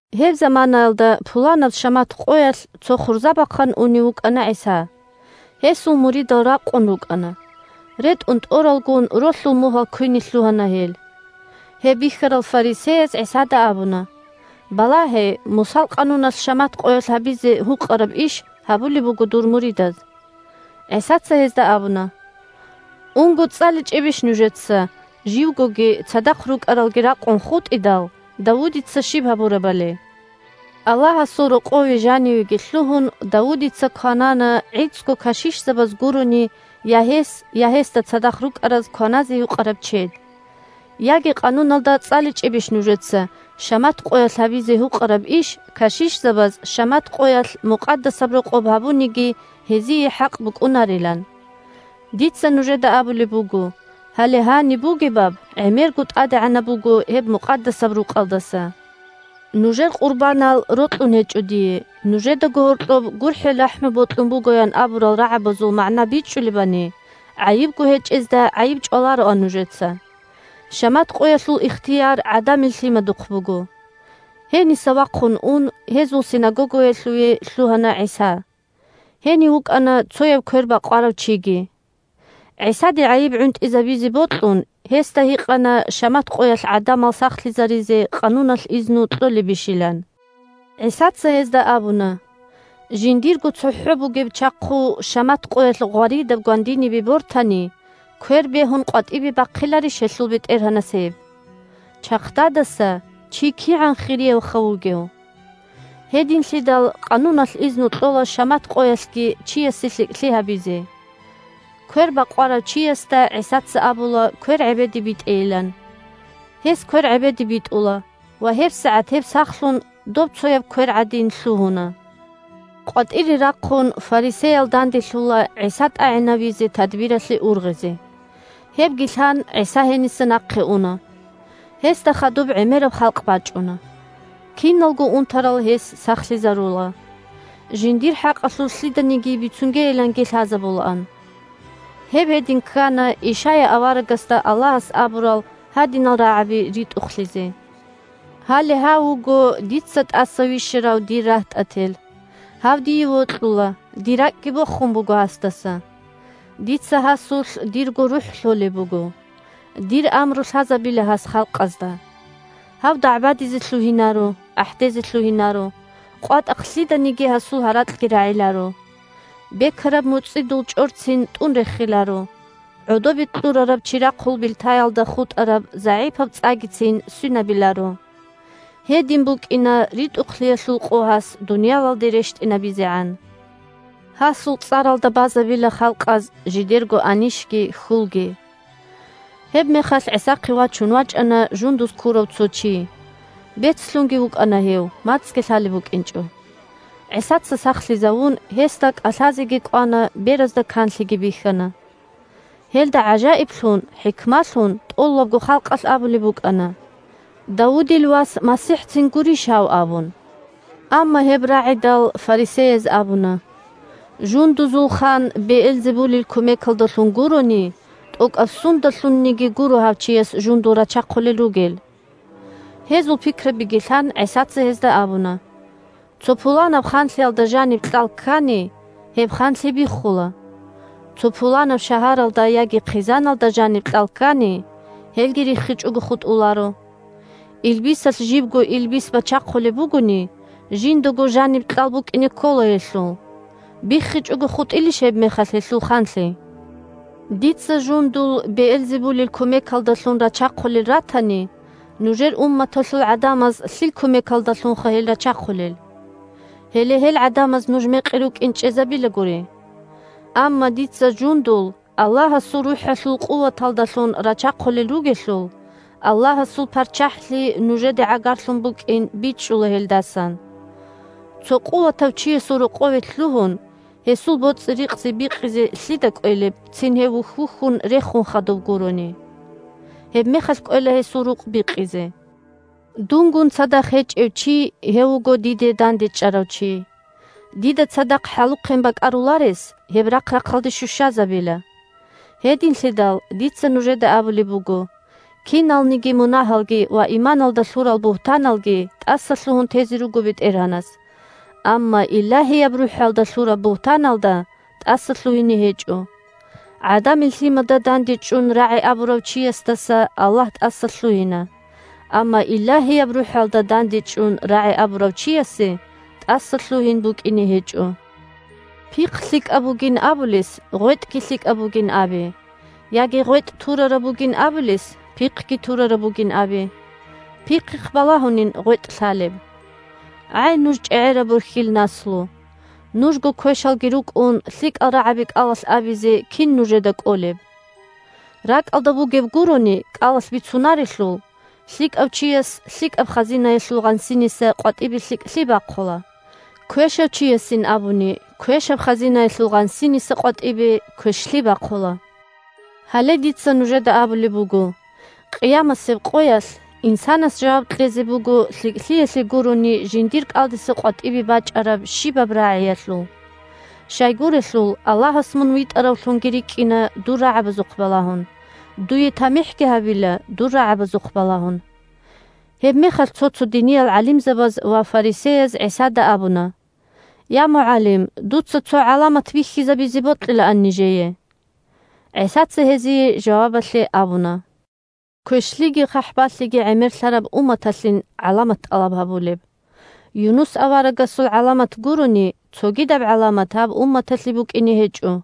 Гьеб заманаялда, пуланаб шамат къоялъ, цо хурзабахъан унев вукӀана ГӀиса. Гьесул муридал ракъун рукӀана. РетӀун тӀоралгун, ролъул мугьал квине лъугьана гьел. Гьеб бихьарал фарисеяз ГӀисада абуна: – Балагье, Мусал къануналъ шамат къоялъ гьабизе гьукъараб иш гьабулеб буго дур муридаз. ГӀисаца гьезда абуна: – Унго, цӀаличӀебищ нужеца, живгоги цадахъ рукӀаралги ракъун хутӀидал, Давудица щиб гьабурабали? Аллагьасул рокъове жанивеги лъугьун, Давудица кванана гӀицӀго кашишзабаз гурони, я гьес, я гьесда цадахъ рукӀараз кваназе гьукъараб чед. Яги Къануналда цӀаличӀебищ нужеца, шамат къоялъ гьабизе гьукъараб иш кашишзабаз шамат къоялъ Мукъадасаб Рокъоб гьабуниги, гьезие хӀакъ букӀунарилан? Дица нужеда абулеб буго: гьале гьаниб бугебаб гӀемерго тӀадегӀанаб буго гьеб Мукъадасаб Рукъалдаса. «Нужер къурбанал рокьун гьечӀо дие, нужедаго гьоркьоб гурхӀел-рахӀму бокьун буго», – ян абурал рагӀабазул магӀна бичӀчӀулебани, гӀайибго гьечӀезда гӀайиб чӀвалароан нужеца. Шамат къоялъул ихтияр ГӀадамил Лъимадухъ буго. Гьениса вахъун ун гьезул синагогаялъуве лъугьана ГӀиса. Гьенив вукӀана цояб квер бакъварав чиги. ГӀисаде гӀайиб гӀунтӀизабизе бокьун, гьесда гьикъана шамат къоялъ гӀадамал сахлъизаризе къануналъ изну кьолебищилан. ГӀисаца гьезда абуна: – Жиндирго цохӀо бугеб чахъу шамат къоялъ гъваридаб гвандинибе бортани, квер бегьун къватӀибе бахъиларищ гьелъул бетӀергьанас гьеб? Чахъдадаса чи кигӀан хириявха вугев! Гьединлъидал къануналъ изну кьола шамат къоялъги чиясе лъикӀлъи гьабизе. Квер бакъварав чиясда ГӀисаца абула квер гӀебеде битӀейилан. Гьес квер гӀебеде битӀула, ва гьебсагӀат гьеб сахлъун, добцояб квер гӀадин, лъугьуна. КъватӀире рахъун фарисеял данделъула ГӀиса тӀагӀинавизе тадбиралъе ургъизе. Гьебги лъан, ГӀиса гьениса нахъе уна. Гьесда хадуб гӀемераб халкъ бачӀуна. Киналго унтарал гьес сахлъизарула. Жиндир хӀакъалъулъ лъиданиги бицунгейиланги лъазабулаан. Гьеб гьедин ккана, Ишая аварагасда Аллагьас абурал гьадинал рагӀаби ритӀухълъизе: «Гьале гьав вуго дица тӀаса вищарав дир рагьтӀател. Гьав дие вокьула, дир ракӀги бохун буго гьасдаса. Дица гьасулъ дирго РухӀ лъолеб буго. Дир амру лъазабила гьас халкъазда. Гьав дагӀбадизе лъугьинаро, ахӀдезе лъугьинаро, къватӀахъ лъиданиги гьасул гьаракьги рагӀиларо. Бекараб муцӀидул чӀорцин тӀун рехиларо, гӀодобе кьурараб чирахъул билтаялда хутӀараб загӀипаб цӀагицин свинабиларо. Гьедин букӀина ритӀухълъиялъул къо гьас дуниялалде рещтӀинабизегӀан. Гьасул цӀаралда базабила халкъаз жидерго анищги хьулги». Гьебмехалъ ГӀисахъе вачун вачӀана жундуз ккурав цо чи. Бецлъунги вукӀана гьев, мацӀги лъалеб букӀинчӀо. ГӀисаца сахлъизавун, гьесда кӀалъазеги кӀвана, беразда канлъиги бихьана. Гьелда гӀажаиблъун-хӀикмалъун тӀолабго халкъалъ абулеб букӀана: – Давудил Вас МасихӀцин гурищ гьав? – абун. Амма гьеб рагӀидал, фарисеяз абуна: – Жундузул хан Беэлзебулил кумекалдалъун гурони, тӀокӀаб сундалъунниги гуро гьав чияс жундул рачахъулел ругел. Гьезул пикрабиги лъан, ГӀисаца гьезда абуна: – Цо пуланаб ханлъиялда жаниб кьал ккани, гьеб ханлъи биххула. Цо пуланаб шагьаралда яги хъизаналда жаниб кьал ккани, гьелги риххичӀого хутӀуларо. Илбисалъ жибго илбис бачахъулеб бугони, жиндаго жаниб кьал букӀине ккола гьелъул. БиххичӀого хутӀилищ гьебмехалъ гьелъул ханлъи? Дица жундул Беэлзебулил кумекалдалъун рачахъулел ратани, нужер умматалъул гӀадамаз лъил кумекалдалъунха гьел рачахъулел? Гьеле гьел гӀадамаз нуж мекъи рукӀин чӀезабила гури. Амма дица жундул Аллагьасул РухӀалъул къуваталдалъун рачахъулел ругелъул, Аллагьасул ПарччахӀлъи нужеде гӀагарлъун букӀин бичӀчӀула гьелдасан. Цо къуватав чиясул рокъове лъугьун, гьесул боцӀи-рикъзи бикъизе лъида кӀвелеб, цин гьев вухь-вухьун рехун хадуб гурони. Гьебмехалъ кӀвела гьесул рукъ бикъизе. Дунгун цадахъ гьечӀев чи, гьев вуго дида дандечӀарав чи. Дида цадахъ хӀалухъен бакӀаруларес гьеб рахъ-рахъалде щущазабила. Гьединлъидал дица нужеда абулеб буго: киналниги мунагьалги ва иманалда лъурал бугьтаналги тӀасалъугьун тезе руго БетӀергьанас. Амма Илагьияб РухӀалда лъураб бугьтаналда тӀасалъугьине гьечӀо. ГӀадамил Лъимада дандечӀун рагӀи абурав чиясдаса Аллагь тӀасалъугьина, амма Илагьияб РухӀалда дандечӀун рагӀи абурав чиясе тӀасалъугьин букӀине гьечӀо. Пихъ лъикӀаб бугин абулес гъветӀги лъикӀаб бугин абе, яги гъветӀ турараб бугин абулес пихъги турараб бугин абе. Пихъихъ балагьунин гъветӀ лъалеб. ГӀай нуж чӀегӀераб борхьил наслу! Нужго квешалги рукӀун, лъикӀал рагӀаби кӀалалъ абизе кин нужеда кӀолеб? РакӀалда бугеб гурони кӀалалъ бицунарелъул. ЛъикӀав чияс лъикӀаб хазинаялъул гъансиниса къватӀибе лъикӀлъи бахъула, квешав чиясин абуни квешаб хазинаялъул гъансиниса къватӀибе квешлъи бахъула. Гьале дица нужеда абулеб буго: къиямасеб къоялъ инсанас жаваб кьезе буго лъикӀлъиялъе гурони жиндир кӀалдиса къватӀибе бачӀараб щибаб рагӀиялъул. Щайгурелъул, Аллагьас мун витӀаравлъунги рикӀкӀина дур рагӀабазухъ балагьун, дуе тамихӀги гьабила дур рагӀабазухъ балагьун. Гьебмехалъ цо-цо диниял гӀалимзабаз ва фарисеяз ГӀисада абуна: – Я, МугӀалим! Дуца цо гӀаламат бихьизабизе бокьилаан нижее. ГӀисаца гьезие жавабалъе абуна: – Квешлъиги хъахӀбалъиги гӀемерлъараб умматалъин гӀаламат тӀалаб гьабулеб. Юнус аварагасул гӀаламат гурони, цогидаб гӀаламат гьаб умматалъе букӀине гьечӀо.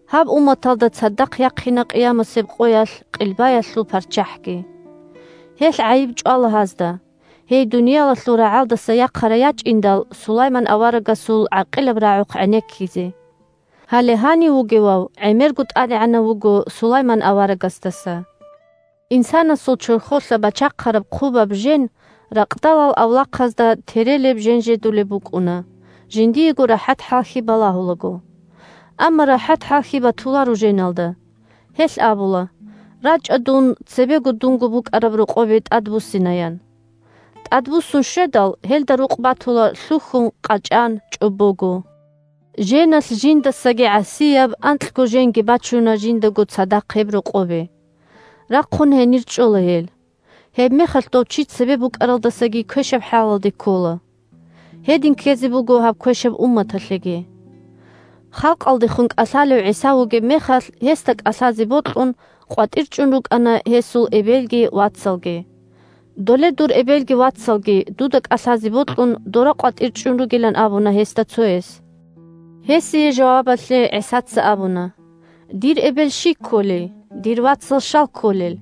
Гьаб умматалда цадахъ яхъина къиямасеб къоялъ Къилбаялъул парччахӀги. Гьелъ гӀайиб чӀвала гьазда, гьей дуниялалъул рагӀалдаса яхъарай ячӀиндал Сулайман аварагасул гӀакъилаб рагӀухъ гӀенеккизе. Гьале гьанив вугевав гӀемерго тӀадегӀанав вуго Сулайман аварагасдаса. Инсанасул чорхолъа бачахъараб хъубаб жен ракъдалал авлахъазда терелеб-женжедулеб букӀуна, жиндиего рахӀат-хӀалхьи балагьулаго. Амма рахӀат-хӀалхьи батуларо женалда. Гьелъ абула: «РачӀа, дун цебе дунго букӀараб рокъобе тӀадбуссина», – ян. ТӀадбуссун щведал, гьелда рукъ батула лъухьун, къачӀан, чӀобого. Женалъ жиндасаги гӀасияб анкьго женги бачуна жиндаго цадахъ гьеб рокъобе. Рахъун гьенир чӀола гьел. Гьебмехалъ дов чи цебе букӀаралдасаги квешаб хӀалалде ккола. Гьедин ккезе буго гьаб квешаб умматалъеги. Халкъалдехун кӀалъалев ГӀиса вугев мехалъ, гьесда кӀалъазе бокьун, къватӀир чӀун рукӀана гьесул эбелги вацалги. Доле дур эбелги вацалги, дуда кӀалъазе бокьун, дора къватӀир чӀун ругилан абуна гьесда цояс. Гьесие жавабалъе ГӀисаца абуна: – Дир эбел щий кколей? Дир вацал щал кколел?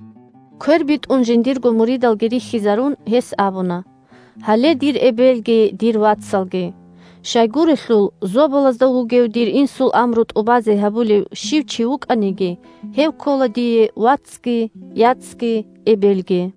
Квер битӀун жиндирго муридалги рихьизарун, гьес абуна: – Гьале дир эбелги дир вацалги. Щайгурелъул, Зобалазда вугев дир Инсул амру тӀубазе гьабулев чи щив вукӀаниги, гьев ккола дие вацги, яцги, эбелги.